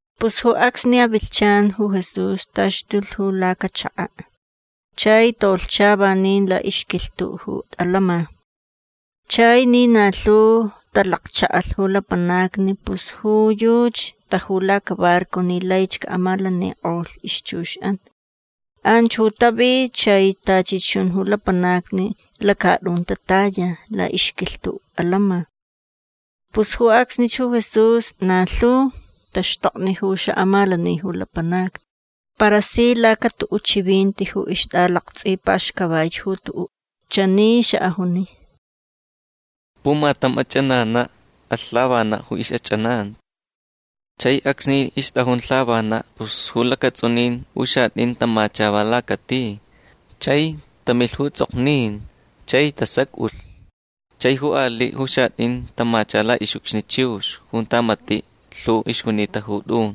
Pus ju acsni avilhchan ju Jesús taxtulh ju lacachaka'. Chai tolhcha vanin la'ixquilhtu' ju atants'in. Chai ni na lhu talakcha'alh ju lapanacni pus ju yuchi taju lacabarco ni laich ca'amalanik'olh ixchux'an. Anch ju tavi chai tachi chun ju lapanacni lacat'un tataya la'ixquilhtu' atants'in. Pus ju acsnich ju Jesús na lhu taxtokni ju xa'amalani ju lapanacni. Para si lacatu'u' chivinti ju ixt'alakts'ipaxcavaich ju tu'u'. Chani xa'ajuni: ―Pumatam ach'anana' alh lhavana' ju ix'ach'ananti. Chai acsni ixt'ajun lhavana' pus lacats'unin ju xat'in tamacha va lacati. Chai tamilh ju ts'ok'o chai tasac'ulh. Chai ju ali' ju xat'in tamacha la'ix'ucxni chiux junta mati' lhu ixjunita ju t'un.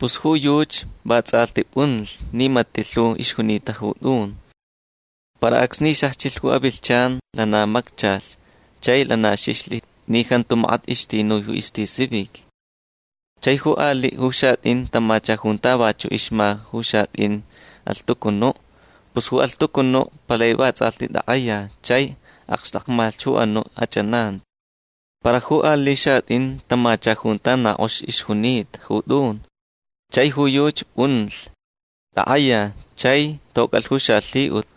Pus ju yuchi va ts'alhti p'unlh ni mati' lhu ixjunita ju t'un. Para acsni xajchilh ju avilhchan lana macchalh chai lana xixlh ni jantu makat ixtinui istisivic. Chai ju ali' ju xat'in tamacha junta vachu' ixma ju xat'in alhtucunu'. Pus ju alhtucunu' palai vats'alhti tak'aya chai akxtakmalh ju anu' ach'ananti. Para ju ali' xat'in tamacha junta na k'ox ixjunita ju t'un. Chai ju yuchi p'unlh. Tak'aya. Chai toc'alh ju xalhi'ut.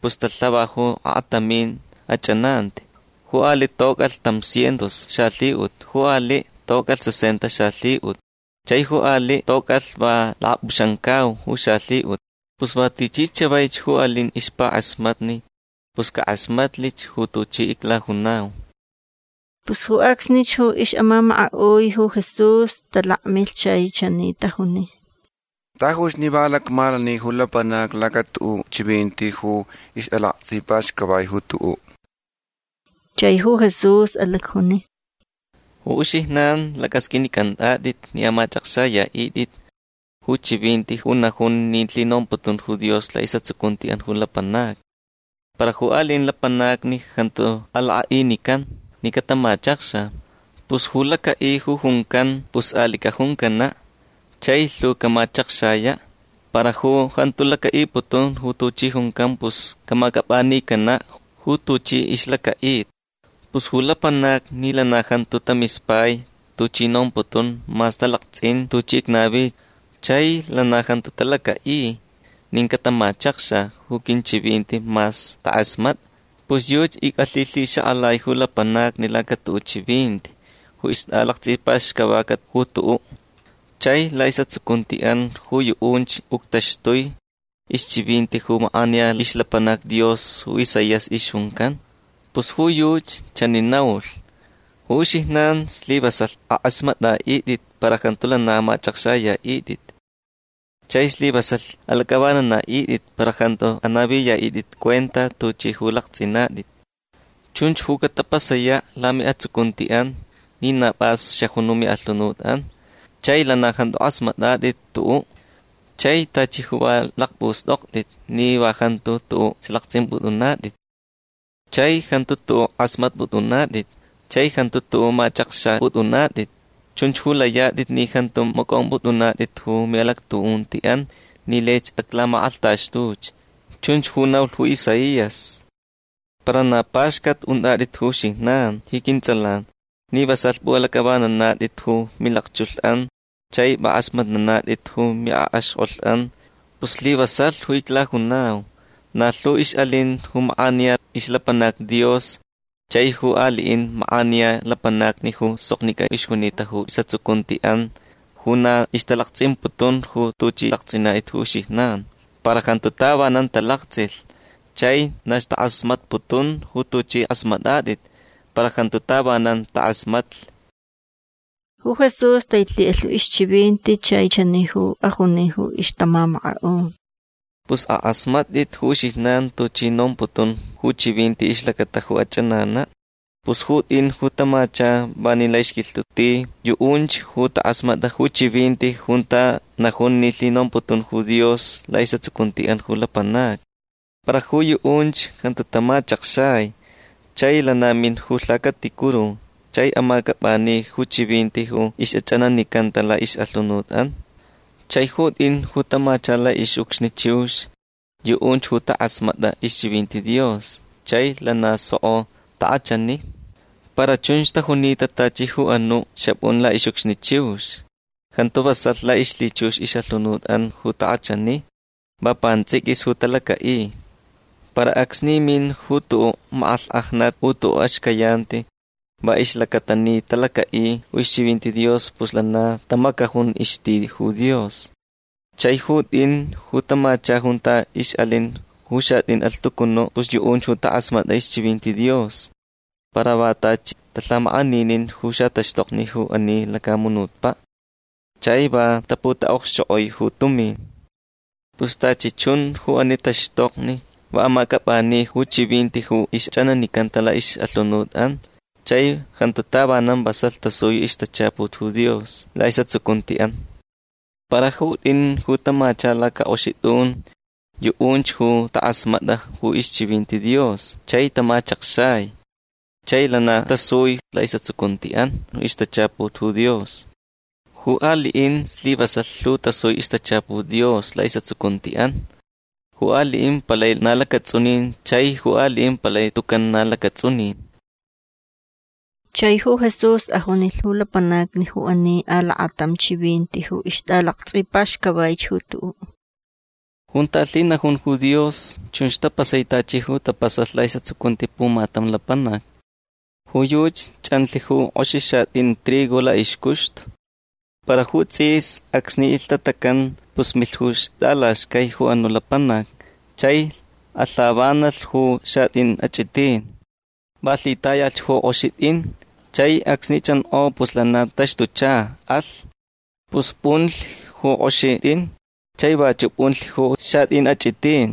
Pus talhava ju akatamin ach'ananti. Ju ali' toc'alh tam cientos xalhi'ut. Ju ali' toc'alh sesenta xalhi'ut. Chai ju ali' toc'alh va lakap'uxamcau ju xalhi'ut. Pus va tichi chavaich ju alin ixpak'asmatni pus cak'asmatlich ju tuchi iclajunau. Pus ju acsnich ju ix'amamaka'ui ju Jesús talakmilh chai chani tajuni: ―Tajuch ni va alacmalani ju lapanacni lacatu'u' chivinti ju ixt'alakts'ipaxcavaich ju tu'u'. Chai ju Jesús alacjuni: ―Ju uxijnan lac'asq'uinic'ant'at'it ni amach'akxaya'it'it ju chivinti ju najun ni lhinomputun ju Dios la'is'atsucunti'an ju lapanacni. Para ju ali'in lapanacni jantu alak'a'inican ni catamachakxa. Pus ju laca'i ju juncan pus ali' cajuncana' chai lhu camachakxaya'. Para ju jantu laca'iputun ju tuchi juncan pus camac'ap'anicana' ju tuchi ixlaca'ita. Pus ju lapanacni ni lana jantu tamispai tuchi nomputun mas talakts'in tuchi icnavi chai lana jantu talaca'i nin catamachakxa ju quinchivinti mas tak'asmat'a pus yuchi ic'alhilhixak'alai ju lapanacni lacatu'u' chivinti ju ixt'alakts'ipaxcavaca ju tu'u'. Chai la'is'atsucunti'an ju yu'unch uctaxtui ixchivinti ju mak'aniya ixlapanac Dios ju Isaías ixjuncan. Pus ju yuchi chani naulh: Ju uxijnan slivasalh ak'asmat'a'it'it para jantu lana amach'akxaya'it'it. Chai slivasalh alac'avanana'it'it para jantu anaviya'it'it cuenta tuch'i ju lakts'inat'it. Chunch ju catapasaya' lami'atsucunti'an ni na p'as xajun ju mi'alhunut'an. Chai lana jantu k'asmat'at'it tu'u'. Chai tachi ju va lakpust'okt'it ni va jantu tu'u' lakts'imp'ut'unat'it. Chai jantu tu'u' k'asmatp'ut'unat'it. Chai jantu tu'u' mach'akxap'ut'unat'it. Chunch ju layat'it ni jantu mac'omp'ut'unat'it ju mi'alactu'unti'an ni laich aclamak'alhtaxtuch. Chunch ju naulh ju Isaías. Para na paxcat unt'at'it ju uxijnan ji quints'alan ni vasalh p'u'alac'avananat'it ju milakchulh'an chai p'ak'asmatnanat'it ju mi'ak'axk'olh'an. Pus slivasalh ju iclajunau. Na lhu ix'alin ju mak'aniya ixlapanacni Dios chai ju ali'in mak'aniya lapanacni ju soknic'a ixjunita ju is'atsucunti'an ju na ixtalakts'imputun ju tuch'i lakts'inat'it ju uxijnan. Para jantu tavanan talakts'ilh. Chai na ixtak'asmatputun ju tuch'i k'asmat'at'it para jantu tavanan tak'asmatlh. Ju Jesús tailhi'alh ju ixchivinti chai chani ju ajuni ju ixtamamaka'un: ―Pus ak'asmat'it ju uxijnan tuchi nomputun ju chivinti ixlacata ju ach'anana'. Pus ju t'in ju tamacha vanin la'ixquilhtu' ti yu'unch ju tak'asmat'a ju chivinti junta najun ni lhinomputun ju Dios la'is'atsucunti'an ju lapanacni. Para ju yu'unch jantu tamachakxai. Chai lana min ju lhacaticuru chai amac'ap'ani ju chivinti ju ix'ach'ananicanta la'ix'alhunut'an. Chai ju t'in ju tamacha la'ix'ucxni chiux yu'unch ju tak'asmat'a ixchivinti Dios chai lana soko tak'achani. Para chunch tajunita tachi ju anu' xap'un la'ix'ucxni chiux. Jantu vasalh la'ixlhichux ix'alhunut'an ju tak'achani. Va pants'iquis ju talaca'i. Para acsni min ju tu'u' mak'alhk'ajnat u tu'u' axcayanti va ixlacata ni talaca'i ju ixchivinti Dios pus lana tamacajun ixti ju Dios. Chai ju t'in ju tamacha junta ix'alin ju xat'in alhtucunu' pus yu'unch ju tak'asmat'a ixchivinti Dios para va tachi talhamak'aninin ju xataxtokni ju ani lacamunutpa' chai va taputa'okxchok'oi ju tumin. Pus tachi chun ju ani taxtokni va amac'ap'ani ju chivinti ju ixch'ananicanta la'ix'alhunut'an chai jantu tavanan vasalh tasui ixtachaput ju Dios la'is'atsucunti'an. Para ju t'in ju tamacha lacak'oxi t'un yu'unch ju tak'asmat'a ju ixchivinti Dios chai tamachakxai. Chai lana tasui la'is'atsucunti'an ixtachaput ju Dios. Ju ali'in slivasalh lhu tasui ixtachaput Dios la'is'atsucunti'an. Ju ali'in palai na lacats'unin chai ju ali'in palai tucan na lacats'unin. Chai ju Jesús ajunilh ju lapanacni ju ani alakatam chivinti ju ixt'alakts'ipaxcavaich ju tu'u'. ―Junta lhinajun ju Dios chunch tapasai tachi ju tapasalh la'is'atsucunti pumatam lapanac. Ju yuchi ch'anlh ju k'oxi xat'in trigo la'ixcuxtu. Para ju ts'is acsni ilhtatacan pus milh ju ixt'alaxcai ju anu' lapanac chai alhavanalh ju xat'in ach'itin. Va lhitayalh ju k'oxi t'in. Chai acsni ch'ank'o pus lana taxtucha. Alh. Pus p'unlich ju k'oxi t'in chai vachu' p'unlich ju xat'in ach'itin.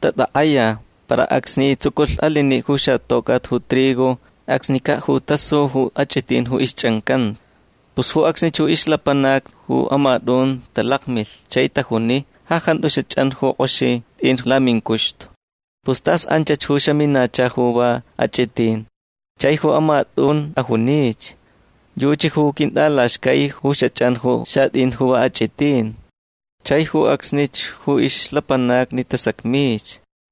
Tatak'aya. Para acsni tsuculh alini' ju xatoc'at ju trigo acsnica' ju tasu ju ach'itin ju ixch'ancanta. Pus ju acsnich ixlapanacni ju amat'un talakmilh chai tajuni: “Ja jantu xach'an ju k'oxi t'in lamincuxtu. Pus tas anchach ju xaminacha ju va ach'itin”. Chai ju amat'un ajunich: “Yuchi ju quint'alaxcai ju xach'an ju xat'in ju va ach'itin”. Chai ju acsnich ju ixlapanacni tasacmich.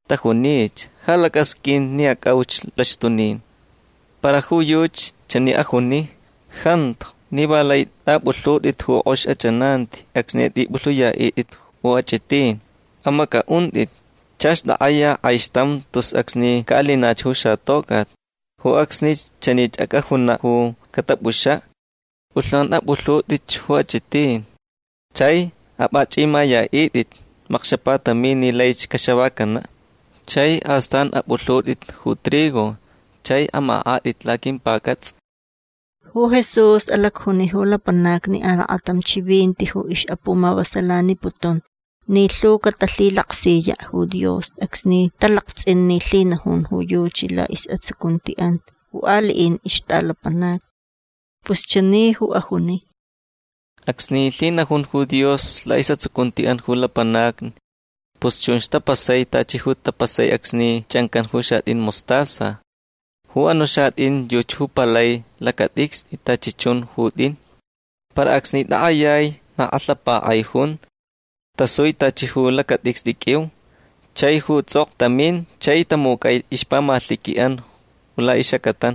Tajunich: “Ja lac'asq'uin ni ac'auch laxtunin”. Para ju yuchi chani ajuni: “Jantu ni va lai t'ap'ulhut'it ju k'ox ach'ananti acsni t'ip'ulhuyat'it ju ach'itin. Amac'a'unt'it. Chach tak'aya k'aixtam tus acsni ca'alinach ju xatoc'at. Ju acsnich chani ac'ajuna' ju catap'uxa': P'ulhnan ap'ulhut'itch ju ach'itin. Chai ap'ach'imaya'it'it makxapatamin ni laich caxavacana'. Chai astan ap'ulhut'it ju trigo chai amak'at'it laquimpac'ats'a”. Ju Jesús alacjuni ju lapanacni alakatam chivinti ju ix'apumavasalaniputun ni lhu catalhilaksiya' ju Dios acsni talakts'in ni lhinajun ju yuchi la'is'atsucunti'an ju ali'in ixt'alapanacni. Pus chani ju ajuni: ―Acsni lhinajun ju Dios la'is'atsucunti'an ju lapanacni pus chunch ju tapasai tachi ju tapasai acsni ch'ancan ju xat'in mostaza. Ju anu' xat'in yuchi ju palai lacat'icst'i tachi chun ju t'in. Para acsni tak'ayai na k'alhapak'ai jun. Tasui tachi ju lacat'icst'i q'uiu. Chai ju ts'ok'o tamin chai tamuc'ai ixpamalhiqui'an la'ix'acatan.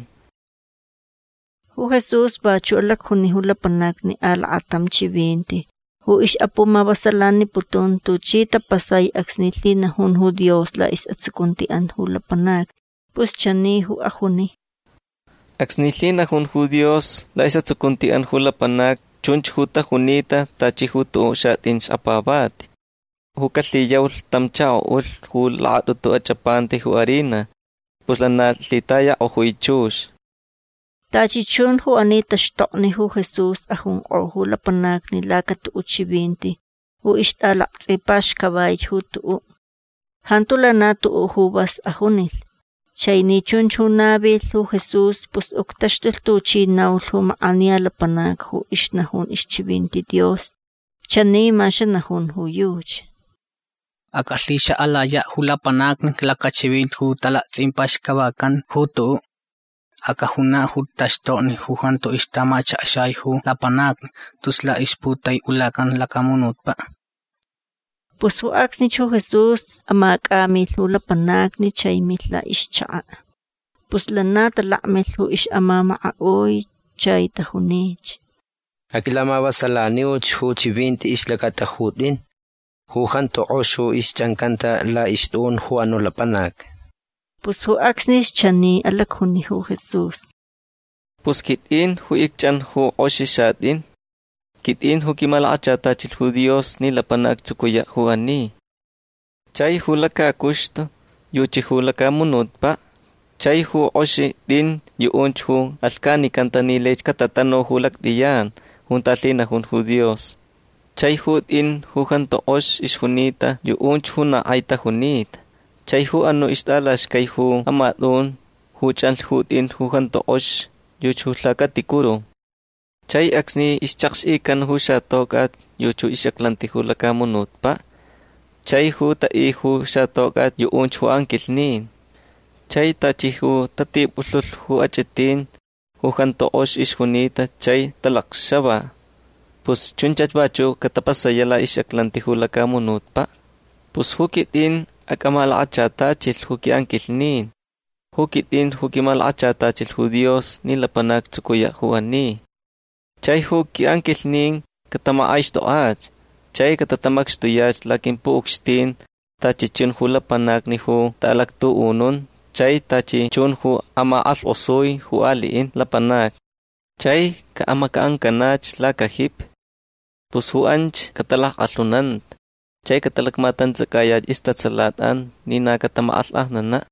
Ju Jesús vachu' alacjuni ju lapanacni alakatam chivinti ju ix'apumavasalaniputun tuchi tapasai acsni lhinajun ju Dios la'is'atsucunti'an ju lapanacni. Pus chani ju ajuni: ―Acsni lhinajun ju Dios la'is'atsucunti'an ju lapanacni chunch ju tajunita tachi ju tu'u' xat'in xkapavati ju calhiyaulh tam chako'ulh ju lakat'utu ach'apanta ju harina. Pus lana lhitayak'ojui chux. Tachi chun ju ani taxtokni ju Jesús ajunk'o ju lapanacni lacatu'u' chivinti ju ixt'alakts'ipaxcavaich ju tu'u'. Jantu lana tu'u' ju vas ajunilh. Chai ni chunch ju navilh ju Jesús pus uctaxtulh tuchi ju naulh ju mak'aniya lapanac ju ixnajun ixchivinti Dios. Chani ma xanajun ju yuchi: Ac'alhixak'alaya' ju lapanacni lacachivinti ju t'alakts'ipaxcavacan ju tu'u'. Ac'ajuna' ju taxtokni ju jantu ixtamachakxai ju lapanacni tus la'ixputai'ulacan lacamunutpa'. Pus ju acsnich ju Jesús amac'amilh ju lapanacni chai milh la'ixchaka'. Pus lana talakmilh ju ix'amamaka'ui chai tajunich: ―Aquilamavasalaniu ju chivinti ixlacata ju t'in ju jantu k'ox ju ixch'ancanta la'ixt'un ju anu' lapanac. Pus ju acsnich chani alacjuni ju Jesús: ―Pus quit'in ju icch'an ju k'oxi xat'in. Quit'in ju quimalakachatachilh ju Dios ni lapanac actsucuya' ju ani. Chai ju lacacuxtu yuchi ju lacamunutpa'. Chai ju k'oxi t'in yu'unch ju alhcanicanta ni laich catatanu ju lact'iyan junta lhinajun ju Dios. Chai ju t'in ju jantu k'ox ixjunita yu'unch ju na k'ai tajunita. Chai ju anu' ixt'alaxcai ju amat'un ju ch'anlh ju t'in ju jantu k'ox yuchi ju lhacaticuru. Chai acsni ixchakx'ican ju xatoc'at yuchi ix'aclanti ju lacamunutpa'. Chai ju ta'i ju xatoc'at yu'unch ju anquilhnin. Chai tachi ju tatip'ulhulh ju ach'itin ju jantu k'ox ixjunita chai talacxava pus chunchach vachu' catapasaya' la'ix'aclanti ju lacamunutpa'. Pus ju quit'in acmalakachatachilh ju qui'anquilhnin. Ju quit'in ju quimalakachatachilh ju Dios ni lapanac actsucuya' ju ani. Chai ju qui'anquilhnin catamak'aixt'ok'ach chai catatamacxtuya' laquimpu'ucxtin tachi chun ju lapanacni ju ta'alactu'unun chai tachi chun ju amak'alhk'osui ju ali'in lapanacni. Chai ca'amaca'ancanach lacajipi. Pus ju anch catak'alhunanta chai catalamatants'acayach istatsalat'an ni na catamak'alhk'ajnana'.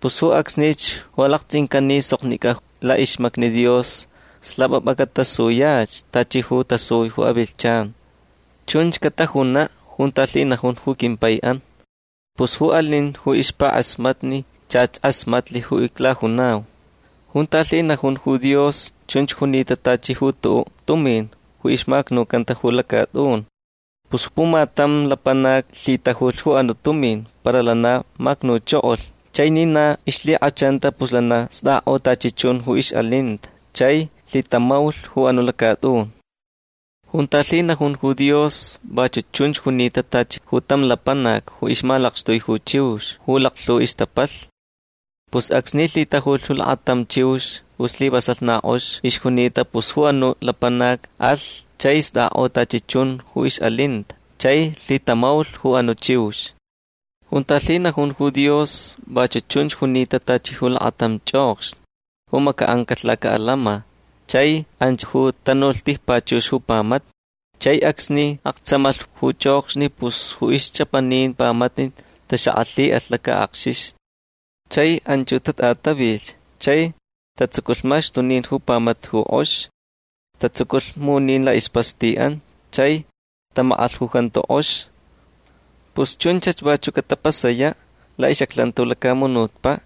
Pus ju acsnich ju alakts'incan ni soknic'a la'ixmacni Dios slap'ap'a catasuyach tachi ju tasui ju avilhchan. Chunch catajuna' junta lhinajun ju quimpai'an. Pus ju alin ju ixpak'asmatni chach k'asmatlh ju iclajunau. Junta lhinajun ju Dios chunch junita tachi ju tu'u' tumin ju ixmacnucanta ju lacat'un. Pus pumatam lapanac lhitajulh ju anu' tumin para lana macnuchokolh. Chai ni na ixlhik'achanta pus lana st'ak'o tachi chun ju ix'alinta chai lhitamaulh ju anu' lacat'un. Junta lhinajun ju Dios vachu' chunch junita tachi ju tam lapanac ju ixmalakxtui ju chiux ju laklhu ixtapalh. Pus acsni lhitajulh lakatam chiux ju slivasalh na k'ox ixjunita pus ju anu' lapanac alh chai st'ak'o tachi chun ju ix'alinta chai lhitamaulh ju anu' chiux. Junta lhinajun ju Dios vachu' chunch junita tachi lakatam ch'okxni ju maca'ancalh laca'alama chai anch ju tanulh tijpachux ju pamata. Chai acsni aktsamalh ju ch'okxni pus ju ixch'apanin pamata taxak'alhi'alh lak'akxixni. Chai anch tat'atavilhch chai tatsuculh maxtunin ju pamata ju k'ox. Tatsuculh munin la'ispasti'an. Chai tamak'alh ju jantu k'ox. Pus chunchach vachu' catapasaya' la'ix'aclanti ju lacamunutpa'.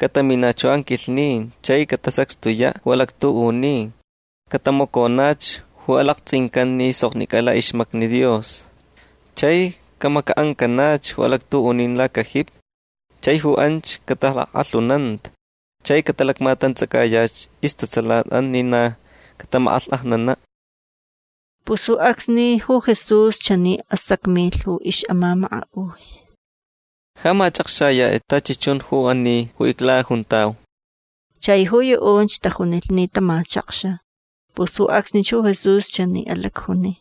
Cataminach ju anquilhnin chai catasacxtuya' ju alactu'unin. Catamaconach ju lakts'incan ni soknic'a la'ixmacni Dios. Chai camaca'ancanach ju alactu'unin lacajipi. Chai ju anch catak'alhunanta chai catalamatants'acayach istatsalat'an ni na catamak'alhk'ajnana'. Pus ju acsni ju Jesús chani asacmilh ju ix'amamaka'ui: ―Ja mach'akxayat'it tachi chun ju ani ju iclajuntau. Chai ju yu'unch tajunilh ni tamachakxa. Pus ju acsnich ju Jesús chani alacjuni: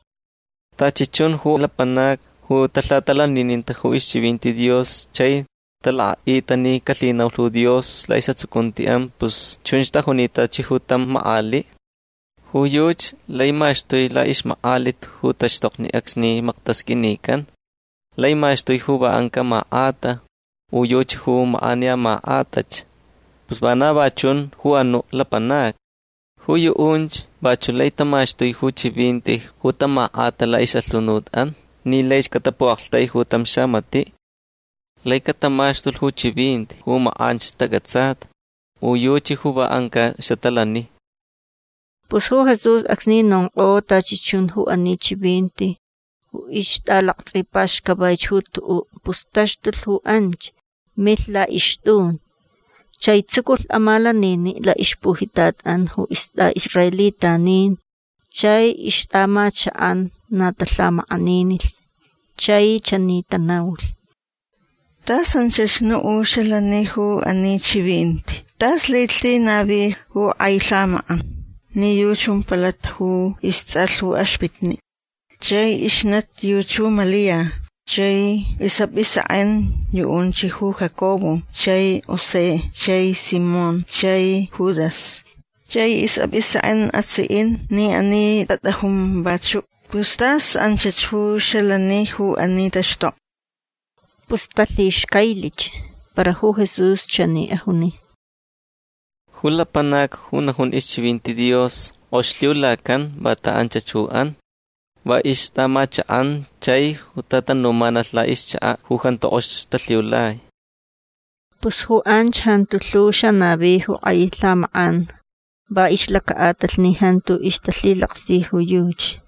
―Tachi chun ju lapanacni ju talhatalanininta ju ixchivinti Dios chai talak'a'ita ni calhinaulh ju Dios la'is'atsucunti'an pus chunch tajunita tachi tam mak'ali'. Ju yuchi lai maxtui la'ixmak'alit ju taxtokni acsni maktasq'uinican. Lai maxtui ju va anca' mak'ata u yuchi ju mak'aniya mak'atach. Pus vana va chun ju anu' lapanacni. Ju yu'unch vachu' lai tamaxtui ju chivinti ju tamak'ata la'ix'alhunut'an ni laich catapu'aktaiju tam xamati'. Lai catamaxtulh ju chivinti ju mak'anch tac'atsata u yuchi ju va anca' xatalani. Pus ju Jesús acsni nonk'o tachi chun ju ani chivinti ju ixt'alakts'ipaxcavaich ju tu'u' pus taxtulh ju anch. Milh la'ixt'un. Chai tsuculh amalanini' la'ixpujitat'an ju ist'a'israelitanin. Chai ixt'a'amachak'an na talhamak'aninilh chai chani tanaulh: ―Tas anchach nu' ju xalani ju ani chivinti. Tas laich lhinavi ju k'ai lhamak'an. Ni yuchi jumpalat ju ists'alh ju axpitni'. Chai ixnati yuchi ju Malia. Chai ju is'ap'isek'en yu'unch ju Jacobo chai José chai Simón chai Judas. Chai is'ap'isek'en atsi'in ni ani tat'ajun vachu'. Pus tas anchach ju xalani ju ani taxtokni. Pus talhixcailich. Para ju Jesús chani ajuni: ―Ju lapanac ju najun ixchivinti Dios k'ox lhiulacan vanta anchach ju an. Va ixt'a'amachak'an chai ju tatanumanalh la'ixchaka' ju jantu k'ox talhiulai. Pus ju anch jantu lhu xanavi ju k'ai lhamak'an va ixlaca'atalh ni jantu ixtalhilaksi ju yuchi.